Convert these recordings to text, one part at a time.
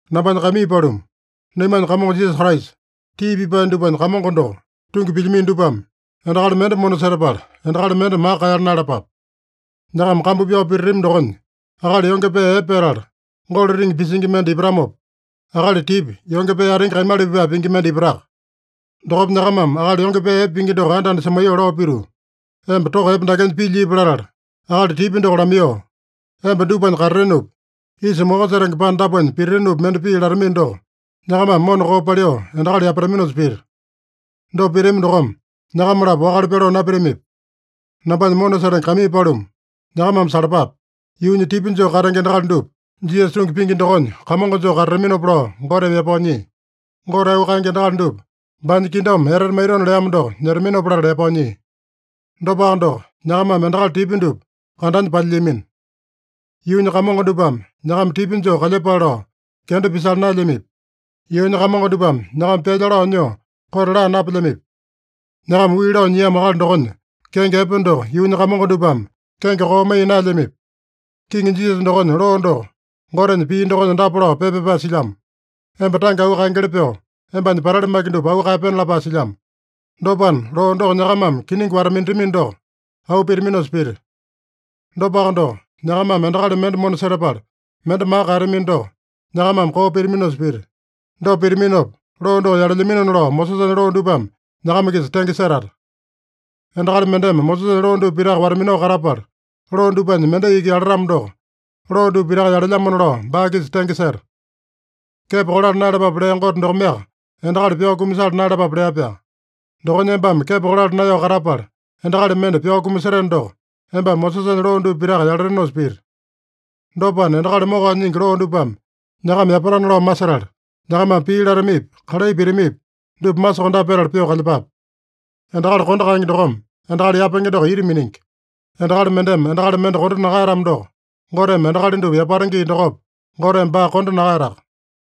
Nambanya kaimii paluma, naimanya Kamongo Jisasa Kraisa, tii pipae dupanya Kamongo doko tungi pilyamino dupame endakali mende mona setapala, endakali mende maka kaeyala naeyalapape. Nyakama kambu pyao pititami dokonya, akali yonge pee epe petala, golo riŋi pisingi mende ipatamopa, akali tipya, yonge pee atingi kaimala pipae pingi mende ipataka. Dokopa nyakamame akali yonge pee epe pingi doko anda-anda semaiyoo lao pituu, “Emba toko epe dakenya pilya ipu” latala, akali tipya doko lamaiyoo, “Emba dupanya katatenopi, isa moko setenge panda dapunya pititinopi mende pii” latamino doko, nyakamame mona koo paliu endakali yapataminosa pita. Dopa pitami dokome, nyakama-lapo wakale pyaloo napitamipi? Nambanya mona setenge kaimii paluma, nyakamame salapape. Yuunya tipya joo katenge endakali dupa Jisasa tungi pingi dokonya kamongo joo katataminopa lao Goteme yapao nyia. Gote auu kaenge endakali dupa baanya kingdom etete maitona leamo doko nyetaminopa latala yapao nyia. Dopaka doko, nyakamame endakali tipya dupa kandanya palyilyamino. Yuunya kamongo dupame nyakama tipya joo kalyepale lao kenda pisala naelyamipi? Yuunya kamongo dupame nyakama pyalya lao nyoo kote laa napelyamipi? Nyakama wii lao nyiamo akali dokonya kenge epe doko yuunya kamongo dupame kenge koo maiya naelyamipi? Kiŋi Jisasa dokonya loo doko Gotenya pii dokonya dapa lao pepa pyapae silyamo: “Emba tange auu kaengeli pyoo, embanya patali maki dupa auu kaeyapena” lapae silyamo. Dopana, loo doko nyakamame kiningi wata-minatamino doko, auu pitaminosa pita. Dopaka doko, nyakamame endakali mende mona setapala, mende maka kaeyatamino doko, nyakamame koo pitaminosa pita. Dopa pitaminopa, loo doko yalelyaminona lao Mosesanya loo dupame nyakama-kisa tenge setata. Endakali mendeme Mosesanya loo dupa pitaka wata-minao katapala, loo dupanya mendai iki yalatamo doko, loo dupa pitaka yalelyamona lao baa-kisa tenge seta. Kepo kolala naeyalapape lea Gote dokomeaka endakali pyao kumasala naeyalapape lea-pyaa. Dokonya embame kepo kolala naeyao katapala, endakali mende pyao kumaseteno doko, embame Mosesanya loo dupa pitaka yalatenosa pita. Dopana, endakali mokao nyingi loo dupame nyakama yapatana lao masetala, nyakamame pii latamipi, kalai pitamipi, dupa masokondape petala pyoo kalyepape. Endakali kondo kaenge dokome endakali yapenge doko ita miningi. Endakali mendeme endakali mende kondo nakaeyatamo doko, Goteme endakali dupa yapata gii dokopa, Goteme baa kondo nakaeyataka.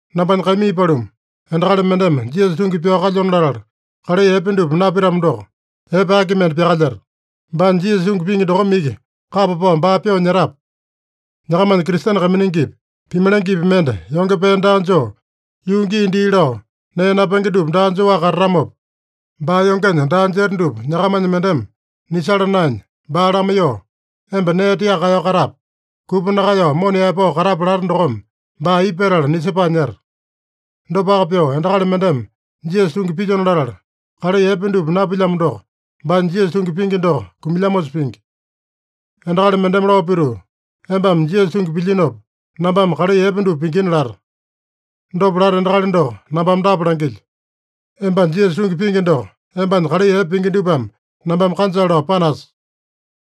Nambanya kaimii paluma, endakali mendeme Jisasa tungi pyao kalyona latala, kalai epe dupa napitamo doko, epe aki mende pyakalyeta? Baanya Jisasa tungi pingi dokome iki kapa pao baa pyoo nyetape? Nyakamanya Kristene kaiminingipi, pimalengepi mende yonge pee daa joo, yuu gii dii lao nee napenge dupa daa joaka katatamopa, baa yongenya daa jeta dupa nyakamanya mendeme nisala naenya, baa lamaiyoo “Emba nee tiaka kaeyao katape. Kupa nakaeyao mona yaepao katape” late dokome, baa aipa petala nisepae nyeta? Dopaka pyoo endakali mendeme Jisasa tungi pilyona latala, kalai epe dupa napilyamo doko, baanya Jisasa tungi pingi doko kumilyamosa pingi. Endakali mendeme lao pituu, “Embame Jisasa tungi pilyinopa, nambame kalai epe dupa pingina” lata. Dopa lata endakali doko nambame dapa langilyo: Embanya Jisasa tungi pingi doko embanya kalai epe pingi dupame nambame kanjale lao panasa.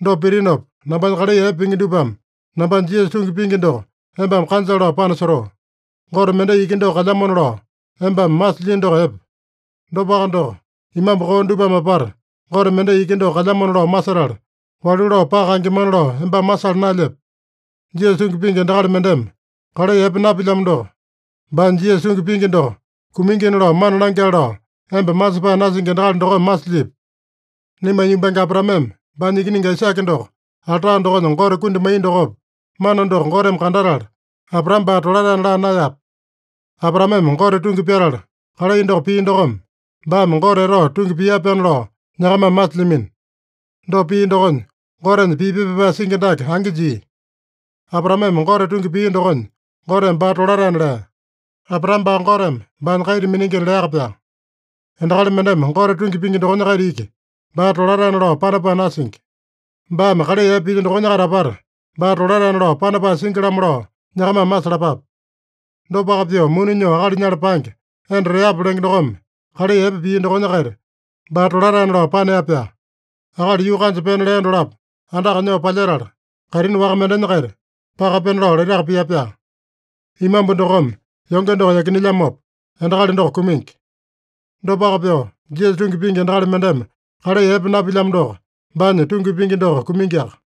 Dopa pitinopa, nambanya kalai epe pingi dupame nambanya Jisasa tungi pingi doko embame kanjale lao panasotoo. Gote mendai iki doko kalyamona lao embame masilyino doko epe. Dopaka doko, imambu koo dupame apata Gote mendai iki doko kalyamona lao masetala, walu lao paka kaengemana lao embame masala naelyepe? Jisasa tungi pingi endakali mendeme kalai epe napilyamo doko, baanya Jisasa tungi pingi doko kumingina lao mana langyale lao emba masepae nasingi endakali dokome masilyipi? Naimanya yumbange Abraameme baanya ikiningi Aisake doko alta dokonya Gote kundi maiya dokopa, mana doko Goteme kandatala, Abraame baa tolataena laa naeyape? Abraameme Gote tungi pyatala kalai doko pia dokome, baame Gote etao tungi pia-pyaana lao nyakamame masilyamino. Dopa pia dokonya, Gotenya pii pepa pyapae singi dake angi jia: “Abraameme Gote tungi pia dokonya, Goteme baa tolataena lea.” Abraame baa Goteme baanya kaita miningina leaka-pyaa. Endakali mendeme Gote tungi pingi dokonya-kaita iki, baa tolataena lao panapae nasingi. Baame kalai epe pilya dokonya-kaita apata, baa tolataena lao panapae singi-lamo lao nyakamame masalapape. Dopaka pyoo muni nyoo akali nyala paenge, enda Reapa lenge dokome kalai epe pia dokonya-kaita baa tolataena lao panea-pyaa. Akali yuu kanja pena lea dolapo andaka nyoo palyetala, kaitini waka mendenya-kaita paka pena lao laitaka pia-pyaa. Imambu dokome yonge doko yakinelyamopa, endakali doko kumingi. Dopaka pyoo, Jisasa tungi pingi endakali mendeme kalai epe napilyamo doko, baanya tungi pingi doko kumingiaka.